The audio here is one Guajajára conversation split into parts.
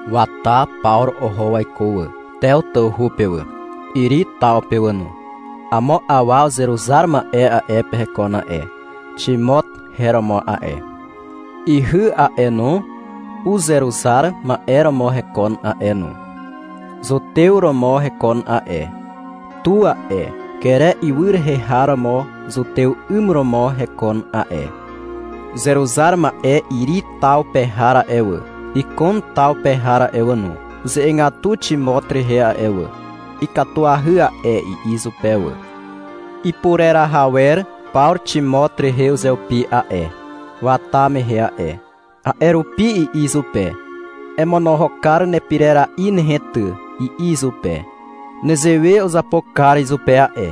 Wata Pawru oho waiko wà, Tew tawhu pe wà, Iri taw pe wà no. Amo awa uzeruzar ma'e a'e pe hekon a'e. Ximot her romo a'e. Ihy a'e no, uzeruzar ma'e romo hekon a'e no, zutew romo hekon a'e. Tu a'e, Kere ywy rehe har romo zutew 'ym romo hekon a'e. Uzeruzar ma'e Iri taw pe har a'e wà, Ikon taw pe har a'e wà no, uze'egatu Ximot rehe a'e wà. — Ikatuahy a'e, i'i izupe wà. Ipureraha wer Pawru Ximot rehe uzeupi a'e, wata mehe a'e. A'e rupi i'i izupe. — Emonohok kar nepirera'i nehe ty, i'i izupe. Nezewe uzapo kar izupe a'e,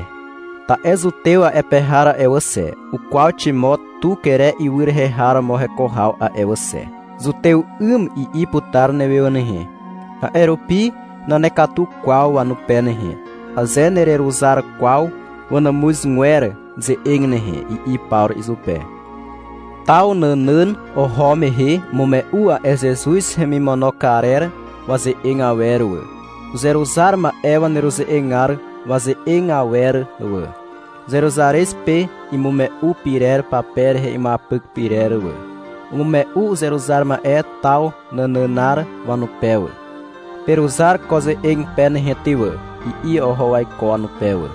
ta'e zutew a'e pe har a'e wà xe, ukwaw Ximot tu Kere ywy rehe har romo heko haw a'e wà xe. — Zutew 'ym, i'i putar newe wà nehe. A'e rupi nanekatu kwaw wanupe nehe, aze nereruzar kwaw wanàmuzgwer ze'eg nehe, i'i Pawru izupe. Taw nànàn oho mehe umume'u a'e Zezuz hemimono karer waze'eg awer wà, uzeruzar ma'e waneruze'egar waze'eg awer wà, Zeruzarez pe imume'u pyrer pape rehe imuapyk pyrer wà. Umume'u uzeruzar ma'e taw nànànar wanupe wà. — Peruzar ko ze'eg pe nehe ty wà, i'i oho waiko wanupe wà.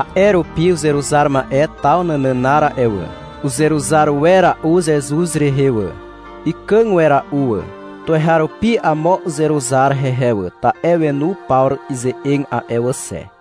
A'e rupi uzeruzar ma'e taw nànànar a'e wà, uzeruzar wera'u Zezuz rehe wà. Ikàg wera'u wà. Tuweharupi amo uzeruzar hehe wà, ta'e wenu Pawru ize'eg a'e wà xe.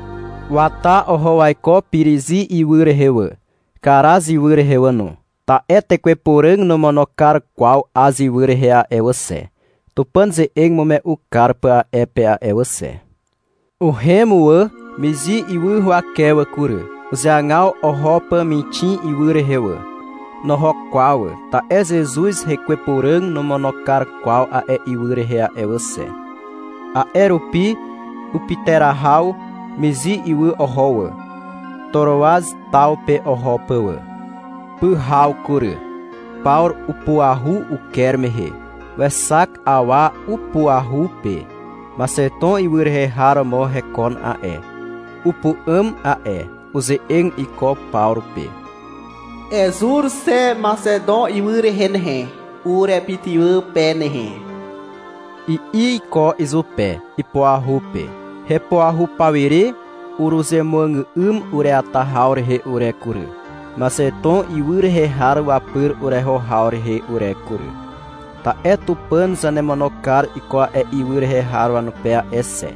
Wata oho waiko Pirizi ywy rehe wà, Karaz ywy rehe wà no, ta'e Tekwe Puràg nomono kar kwaw Az ywy rehe a'e wà xe, Tupàn ze'eg imume'u kar pà a'e pe a'e wà xe. Uhem wà Mizi ywy huwake wà kury. Uzeagaw oho pà Mixin ywy rehe wà. Noho kwaw wà, ta'e Zezuz Hekwe Puràg nomono kar kwaw a'e ywy rehe a'e wà xe. A'e rupi upyterahaw Mizi ywy oho wà, Toroaz taw pe oho pà wà. Pyhaw kury. Pawru upuahu uker mehe. Wexak awa upuahu pe. Maxeton ywy rehe har romo hekon a'e. Upu'àm a'e. Uze'eg iko Pawru pe. — Ezur xe Maxeton ywy rehe nehe, urepytywà pe nehe, i'i iko izupe, ipuahu pe. Hepuahu pawire uruzemuàgà'ym ureata haw rehe ure kury, Maxeton ywy rehe har wapyr ureho haw rehe ure kury. — Ta'e Tupàn zanemono kar iko a'e ywy rehe har wanupe a'e xe,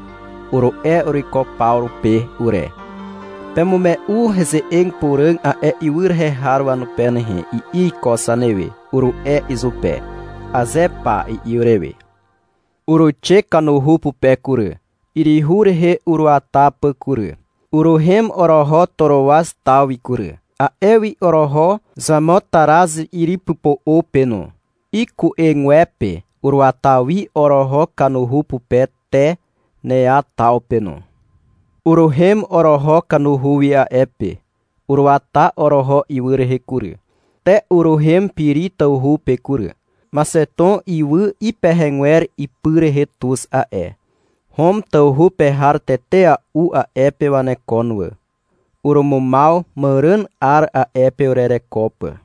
uru'e uruiko Pawru pe ure. — Pemume'u heze'eg puràg a'e ywy rehe har wanupe nehe, i'i iko zanewe, uru'e izupe. — Aze pa, i'i urewe. Uruixe kanuhu pupe kury, yryhu rehe uruata pà kury. Uruhem oroho Toroaz taw wi kury. A'e wi oroho Xamotaraz yrypypo'o pe no. Iku'egwepe uruata wi oroho kanuhu pupe te Nea taw pe no. Uruhem oroho kanuhu wi a'e pe. Uruata oroho ywy rehe kury, te uruhem Piri tawhu pe kury. Maxeton ywy ipehegwer ipy rehe tuz a'e. Hom tawhu pe har tetea'u a'e pe wanekon wà. Urumumaw màràn 'ar a'e pe urereko pà.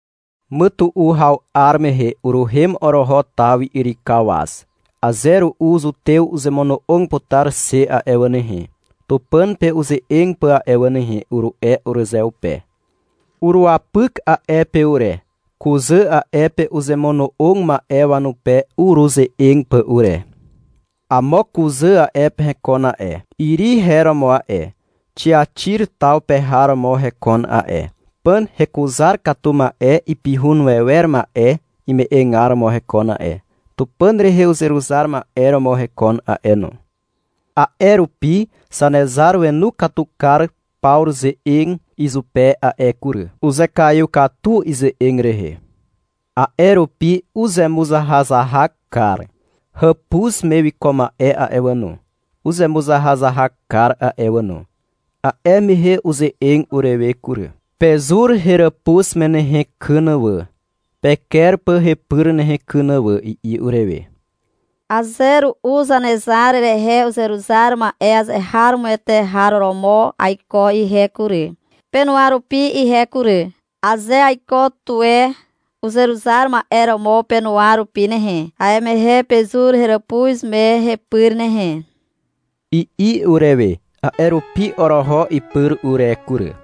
Mytu'u haw 'ar mehe uruhem oroho taw wi yrykaw waz. — Aze ru'u zutew uzemono'og putar xe a'e wà nehe, Tupàn pe uze'eg pà a'e wà nehe, uru'e urezeupe. Uruwapyk a'e pe ure, kuzà a'e pe uzemono'og ma'e wanupe uruze'eg pà ure. Amo kuzà a'e pe hekon a'e. Iri her romo a'e, Xiaxir taw pe har romo hekon a'e. Pàn hekuzar katu ma'e ipihun wewer ma'e ime'egar romo hekon a'e. Tupàn rehe uzeruzar ma'e romo hekon a'e no. A'e rupi Zanezar wenu katu kar Pawru ze'eg izupe a'e kury. Uzekaiw katu ize'eg rehe. A'e rupi uzemuzahazahak kar. Hàpuz me wiko ma'e a'e wà no, uzemuzahazahak kar a'e wà no. A'e mehe uze'eg urewe kury. — Pezur heràpuz me nehe kyn wà, peker pà hepyr nehe kyn wà, i'i urewe. — Aze ru'u Zanezar rehe uzeruzar ma'e azeharomoete har romo aiko ihe kury, penuwa rupi ihe kury. Aze aiko tuwe uzeruzar ma'e romo penuwa rupi nehe, a'e mehe pezur heràpuz me hepyr nehe, i'i urewe. A'e rupi oroho ipyr ure kury.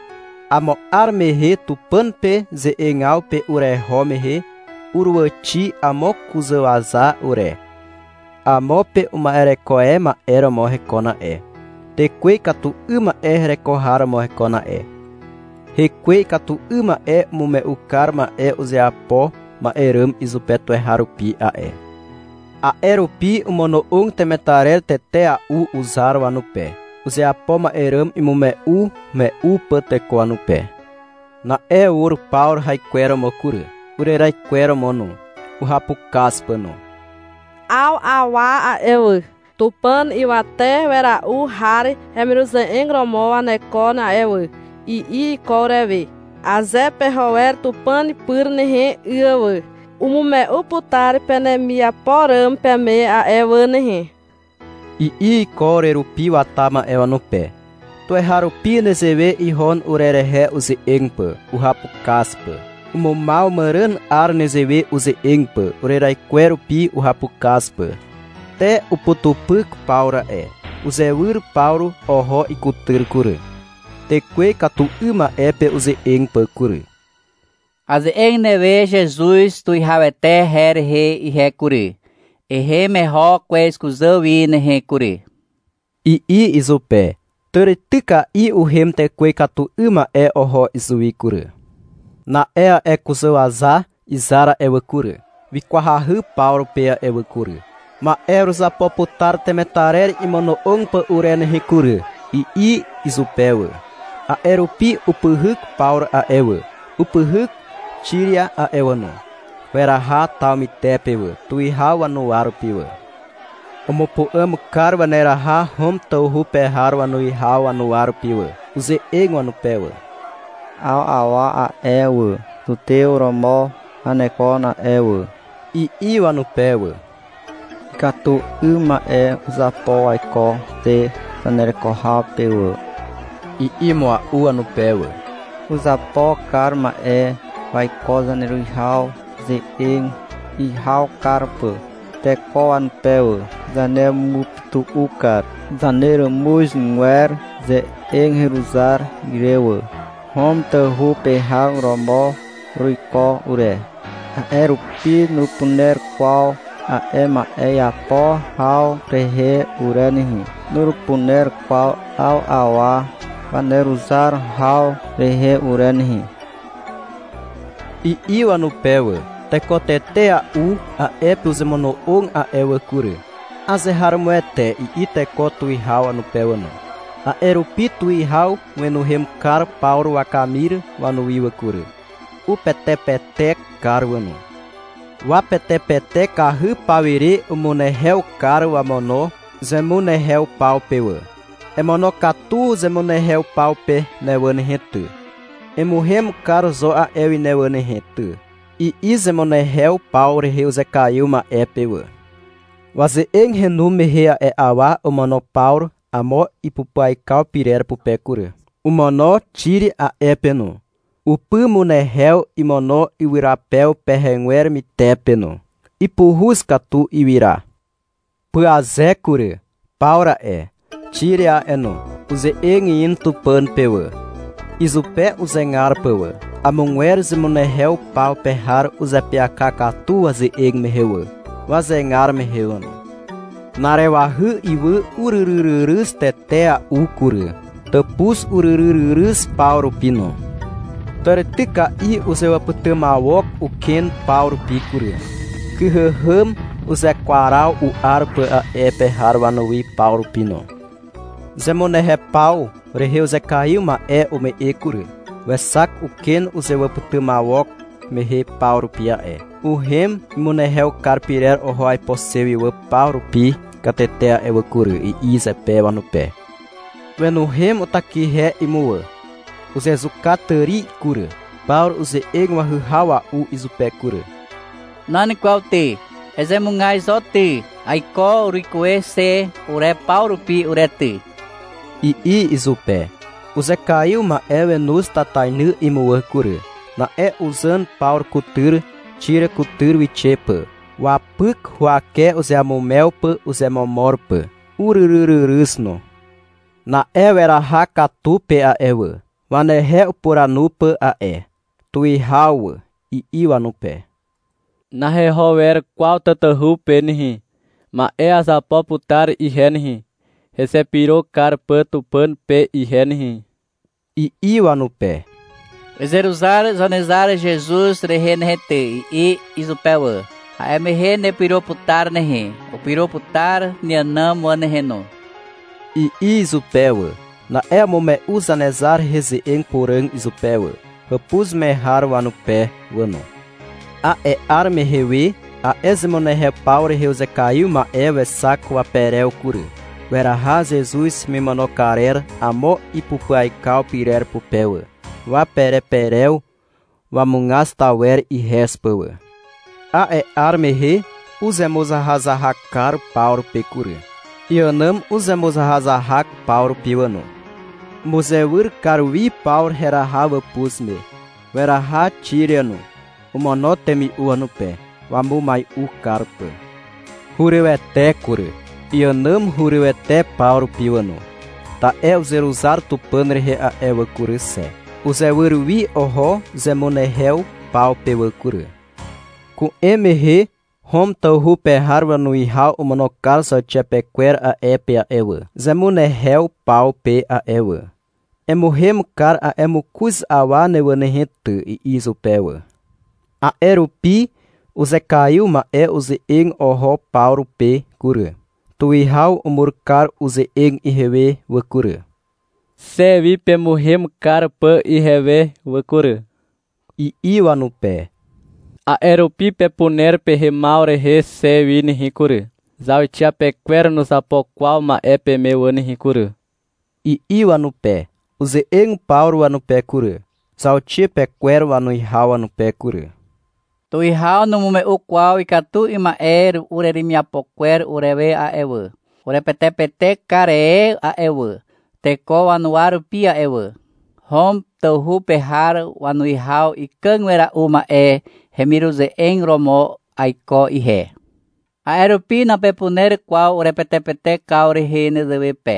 Amo 'ar mehe Tupàn pe ze'egaw pe ureho mehe uruàwàxi amo kuzàwaza ure. Amo pe uma'ereko e ma'e romo hekon a'e. Tekwe ikatu 'ym ma'e hereko har romo hekon a'e. Hekwe ikatu 'ym ma'e umume'u kar ma'e uzeapo ma'e ràm izupe tuweharupi a'e. A'e rupi omono'og temetarer tetea'u uzar wanupe, uzeapo ma'e ràm imume'ume'u pà teko wanupe. Na'e ur Pawru haikweromo kury, ureraikweromo no, uhapukaz pà no. — 'Aw awa a'e wà, Tupàn Ywate Wera'u Har hemiruze'eg romo wanekon a'e wà, i'i iko urewe. — Aze peho wer Tupàn pyr nehe, 'y wà, umume'u putar penemiapo ràm peme a'e wà nehe, i'i iko urerupi wata ma'e wanupe. Tuweharupi nezewe ihon urerehe uze'eg pà, uhapukaz pà. Umumaw màràn 'ar nezewe uze'eg pà, ureraikwer rupi uhapukaz pà. Te, uputupyk Pawru a'e. Uzewyr Pawru oho ikutyr kury, tekwe ikatu 'ym ma'e pe uze'eg pà kury. -Aze'eg newe Zezuz Tuwihawete her rehe ihe kury, ehem eho kwez kuzà wi nehe kury, i'i izupe. Tàrityka'i uhem tekwe ikatu 'ym ma'e oho izuwi kury. Na'e a'e kuzàwaza izar a'e wà kury, wikwahy Pawru pe a'e wà kury. — Ma'e uruzapo putar temetarer imono'og pà ure nehe kury, i'i izupe wà. A'e rupi upyhyk Pawru a'e wà, upyhyk Xiria a'e wà no. Weraha taw mytepe wà, tuwihaw wanuwa rupi wà. Umupu'àm kar waneraha Hom tawhu pe har wanuwihaw wanuwa rupi wà. Uze'eg wanupe wà. — 'Aw awa a'e wà, zutew romo wanekon a'e wà, i'i wanupe wà. — Ikatu 'ym ma'e uzapo waiko xe zanereko haw pe wà, i'i mua'u wanupe wà. Uzapo kar ma'e waiko zaneruwihaw ze'eg ihaw kar pà teko wanupe wà. Zanemupytu'u kar zaneràmuzgwer ze'eg heruzar ire wà. Hom tawhu pe har romo uruiko ure, a'e rupi nurupuner kwaw a'e ma'e iapo haw rehe ure nehe. Nurupuner kwaw 'aw awa waneruzar haw rehe ure nehe, i'i wanupe wà. Teko tetea'u a'e pe uzemono'og a'e wà kury. — Azeharomoete, i'i teko tuwihaw wanupe wà no. A'e rupi tuwihaw wenuhem kar Pawru wakamir wanuwi wà kury. Upetepetek kar wà no. Wapetepetekahy pawire umunehew kar wamono zemunehew paw pe wà. — Emonokatu zemunehew paw pe ne wà nehe ty, emuhem kar zo a'e wi ne wà nehe ty, i'i zemunehew paw rehe uzekaiw ma'e pe wà. Waze'eg henu mehe a'e awa omono Pawru amo ipupyaikaw pyrer pupe kury, omono Xiria a'e pe no. Upymunehew imono ywyrapew pehegwer mytepe no. Ipuhuz katu ywyra. Pyaze kury. Pawru a'e, Xiria a'e no, uze'eg in Tupàn pe wà, izupe uzegar pà wà. Amogwer zemunehew paw pe har uzeapyaka katu waze'eg mehe wà, wazegar mehe wà no. Na'arewahy ywy uryryryryz tetea'u kury. Tàpuz uryryryryz paw rupi no. Tàrityka'i uzewàpytymawok uken paw rupi kury. Kyhàhàm uzekwaraw u'ar pà a'e pe har wanuwi paw rupi no. Zemunehew paw rehe uzekaiw ma'e ume'e kury. Wexak uken uzewàpytymawok mehe paw rupi a'e. — Uhem imunehew kar pyrer oho aipo xe wi paw rupi katete a'e wà kury, i'i zepe wanupe. Wenuhem utakihe imuwà. Uzezuka tàri kury. Pawru uze'eg wahyhawa'u izupe kury. -Nan kwaw ty, ezemugaz zo ty, aiko uruikuwe xe ure paw rupi ure ty, i'i izupe. Uzekaiw ma'e wenoz tatainy imuwà kury. Na'e uzàn Pawru kutyr Xiria kutyr wixe pà, wapy huwake uzeamumew pà uzemomor pà. Uryryryryz no. Na'e weraha katu pe a'e wà, wanehe upuranu pà a'e. — Tuwihaw wà, i'i wanupe. -Naheho wer kwaw tatahu pe nehe. Ma'e azapo putar ihe nehe, hezepyro kar pà Tupàn pe ihe nehe, i'i wanupe. — Ezeruzar Zanezar Zezuz rehe nehe ty, i'i izupe wà. — A'e mehe nepyro putar nehe. Upyro putar neànàm wà nehe no, i'i izupe wà. Na'e umume'u Zanezar rehe ze'eg puràg izupe wà, hàpuz me har wanupe wà no. A'e 'ar mehe we a'e zemunehew paw rehe uzekaiw ma'e wexak waperew kury. Weraha Zezuz hemimono karer amo ipupyaikaw pyrer pupe wà, wapereperew wamugaz tawer ihez pà wà. A'e 'ar mehe uzemuzahazahak kar Pawru pe kury. Iànàm uzemuzahazahak paw rupi wà no. Umuzewyr kar wi Pawru heraha wàpuz me. Weraha Xiria no. Omono temi'u wanupe, wamumai'u kar pà. Hurywete kury, iànàm hurywete paw rupi wà no, ta'e uzeruzar Tupàn rehe a'e wà kury xe. (Uzewyr wi oho zemunehew paw pe wà kury.) Ku'em mehe Hom tawhu pe har wanuwihaw omono kar zauxiapekwer a'e pe a'e wà, zemunehew paw pe a'e wà. — Emuhem kar a'e mokoz awa ne wà nehe ty, i'i izupe wà. A'e rupi uzekaiw ma'e uze'eg oho Pawru pe kury. — Tuwihaw umur kar uze'eg ihewe wà kury, xe wi pemuhem kar pà ihewe wà kury, i'i wanupe. — A'e rupi pepuner pehemaw rehe xe wi nehe kury. Zauxiapekwer nuzapo kwaw ma'e peme wà nehe kury, i'i wanupe. Uze'eg Pawru wanupe kury, zauxiapekwer wanuwihaw wanupe kury. -Tuwihaw numume'u kwaw ikatu 'ym ma'e ureremiapo kwer urewe a'e wà. Urepetepetek kar e a'e wà, teko wanuwa rupi a'e wà. Hom tawhu pe har wanuwihaw ikàg wera'u ma'e hemiruze'eg romo aiko ihe. A'e rupi napepuner kwaw urepetepetekaw rehe nezewe pe.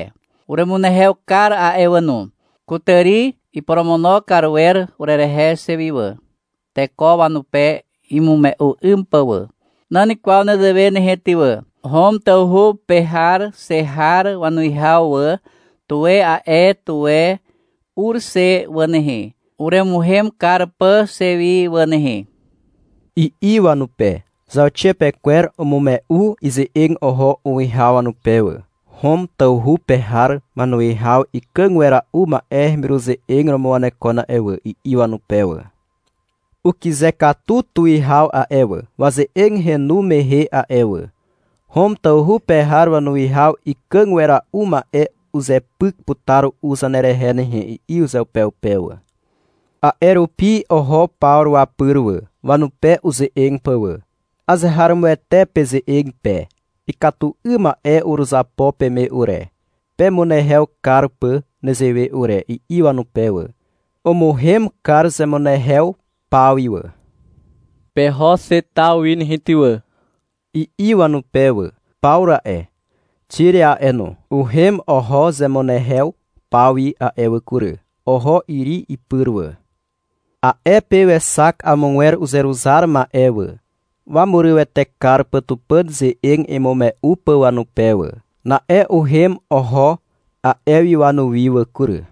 Uremunehew kar a'e wà no. Kutàri iporomono kar wer urerehe xe wi wà, teko wanupe imume'u 'ym pà wà. Nan kwaw nezewe nehe ty wà. Hom tawhu pe har xe har wanuwihaw wà, tuwe a'e tuwe ur xe wà nehe, uremuhem kar pà xe wi wà nehe, i'i wanupe. Zauxiapekwer umume'u ize'eg oho uwihaw wanupe wà. — Hom tawhu pe har wanuwihaw ikàg wera'u ma'e hemiruze'eg romo wanekon a'e wà, i'i wanupe wà. Ukyze katu tuwihaw a'e wà, waze'eg henu mehe a'e wà. — Hom tawhu pe har wanuwihaw ikàg wera'u ma'e uzepyk putar ru'u zanerehe nehe, i'i uzeupeupe wà. A'e rupi oho Pawru wapyr wà, wanupe uze'eg pà wà. — Azeharomoete peze'eg pe. Ikatu 'ym ma'e uruzapo peme ure, pemunehew kar pà nezewe ure, i'i wanupe wà. Umuhem kar zemunehew paw wi wà. — Peho xe taw wi nehe, ty wà, i'i wanupe wà. Pawru a'e, Xiria a'e no, uhem oho zemunehew paw wi a'e wà kury. Oho Iri ipyr wà. A'e pe wexak amogwer uzeruzar ma'e wà, wamurywete kar pà Tupàn ze'eg imume'u pà wanupe wà. Na'e uhem oho a'e wi wanuwi wà kury.